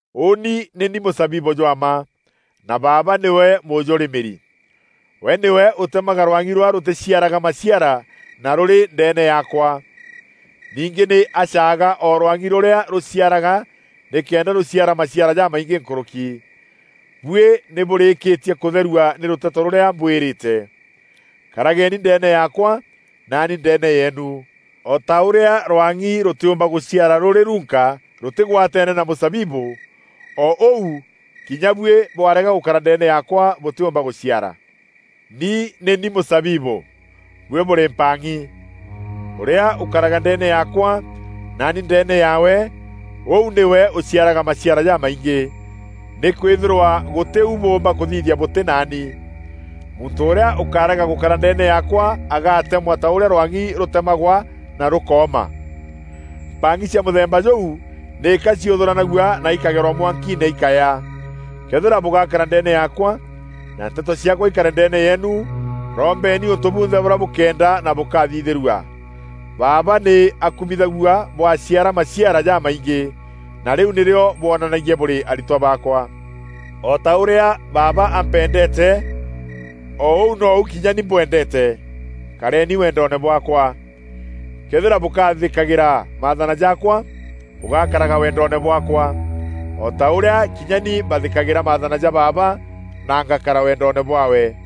“Ûûni nî ni mûzabibû jwa mma, na Baaba nîwe mûjûrîmîri. We nîwe ûtemaga rwang'i rûrîa rûtîciaraga maciara na rûrî ndeene yaakwa. Ningî nî acaaga o rwang'i rûrîa rûciaraga nîkenda rûciara maciara jamaingî nkûrûki. Buî nî bûrîkîtie kûtherua nî rûteto rûrîa mbwîrîte. Karageni ndeene yaakwa, naani ndeene yeenu. O ta ûrîa rwang'i rûtîûmba gûciara rûrî runka rûtîgwateene na mûzabibû, o ûu kinya buî bwarega gûkara ndeene yaakwa bûtîumba gûciara. “Ni nî ni mûzabibû, buî bûrî mpang'i. Ûrîa ûkaraga ndeene yaakwa, naani ndeene yaawe, ûu nîwe ûciaraga maciara jamaingî, nîkwîthîrwa gûtî u bûûmba kûthithia bûtî naani. Muntû ûrîa ûkarega gûkara ndeene yaakwa agaatemwa ta ûrîa rwang'i rûtemagwa na rûkooma. Mpang'i cia mûthemba jûu nîka ciûthûranagua na ikageerwa mwankiine îkaya. Këethîra bûgaakara ndeene yaakwa, na nteto ciaakwa ikare ndeene yeenu, rombeni ûntû bunthe bûrîa bûkeenda na bûkathithîrua. Baaba nî akumithagua bwaciara maciara jamaingî, na rîu nîrîo bwonanagia bûrî aritwa baakwa. O ta ûrîa Baaba ampendeete, o ûu nou kinya ni mbwendeete. Kareeni wendoone bwaakwa. Këethîra bûkathîkagîra maathana jaakwa, bûgakaraga wendoone bwaakwa, o ta ûrîa kinya ni mbathîkagîra maathana ja Baaba, na ngakara wendoone bwaawe.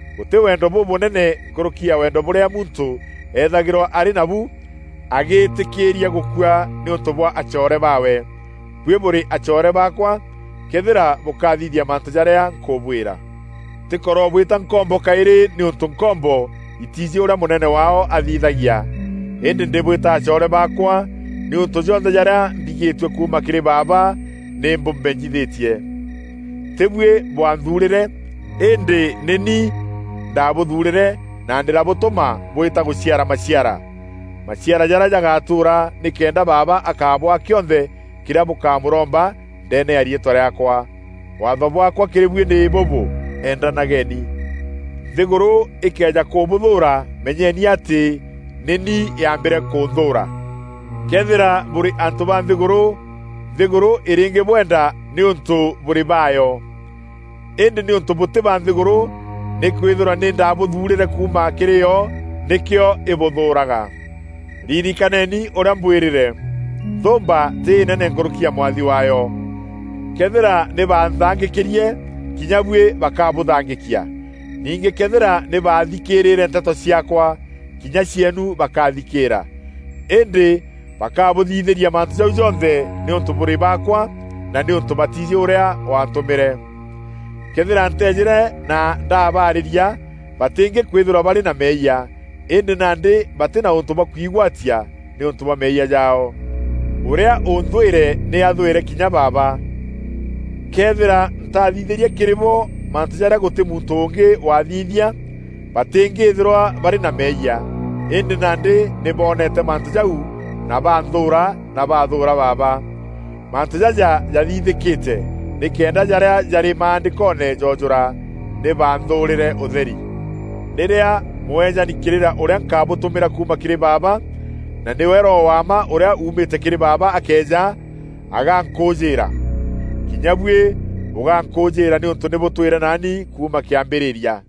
Gûtî wendo bûbûnene nkûrûki ya wendo bûrîa muntû eethîrwa arî nabu agîtîkîîria gûkua nîûntû bwa acoore baawe. Buî bûrî acoore baakwa, këethîra bûkathithia mantû jarîa nkûbwîra. Ntîkorobwîta nkombo kaîrî nîûntû nkombo îtiijî ûrîa mûnene waao athithagia. Îndî ndîbwîta acoore baakwa nîûntû jonthe jarîa mbigîîtue kuuma kîrî Baaba nî mbûmenyithîtie. Tî buî bwaanthuurîre îndî nî ni ndaabûthuurîre na ndîrabûtûma bwîta gûciara maciara, maciara jarîa jagatûûra nîkenda Baaba akabwaa kîonthe kîrîa bûkamûromba ndeene ya riîtwa rîaakwa. Waatho bwaakwa kîrî buî nî bûbû: Endanageni. “Nthîgûrû îkëeja kûbûthûûra meenyeni atî nî ni yaambîre kûnthûûra. Këethîra bûrî antû ba nthîgûrû, nthîgûrû îrîngîbwenda nîûntû bûrî baayo. Îndî nîûntû bûtî ba nthîgûrû nîkwîthîrwa nî ndaabûthuurîre kûuma kîrî yo, nîkîo îbûthûûraga. Ririkaneni ûrîa mbwîrîre, ‘Nthûûmba tî înene nkûrûki ya mwathi waayo.’ Këethîra nî banthangîkîrie, kinya buî bakabûthangîkia. Ningî këethîra nî baathîkîîre nteto ciaakwa kinya cieenu bakathîkîîra. Îndî bakabûthithîria mantû jau jonthe nîûntû bûrî baakwa na nîûntû batiijî ûrîa waantûmîre. Këethîra nteejîre na ndabarîria, batîngîkwîthîrwa barî na meeyia; îndî nandî batî na ûntû bwa kwîgwatia nîûntû bwa meeyia jaao. Ûrîa ûnthwîre nî athwîre kinya Baaba. Këethîra ntaathithîrie kîrî bo mantû jarîa gûtî muntû ûngî wathithia, batîngîthîrwa barî na meeyia. Îndî nandî nî boonete mantû jau na baanthûûra na baathûûra Baaba. Mantû jaja jathithîkîte nîkenda jarîa jarî Maandîkoone joojûra, ‘Nî baanthûûrîre ûtheri!’ “Rîrîa Mûeejani kîrîra ûrîa nkabûtûmîra kuuma kîrî Baaba na nîwe Roho wa mma ûrîa uumîte kîrî Baaba akeeja, agankûûjîîra. Kinya buî bûgankûûjîîra nîûntû nî bûtwîre naani kuuma kîambîrîria.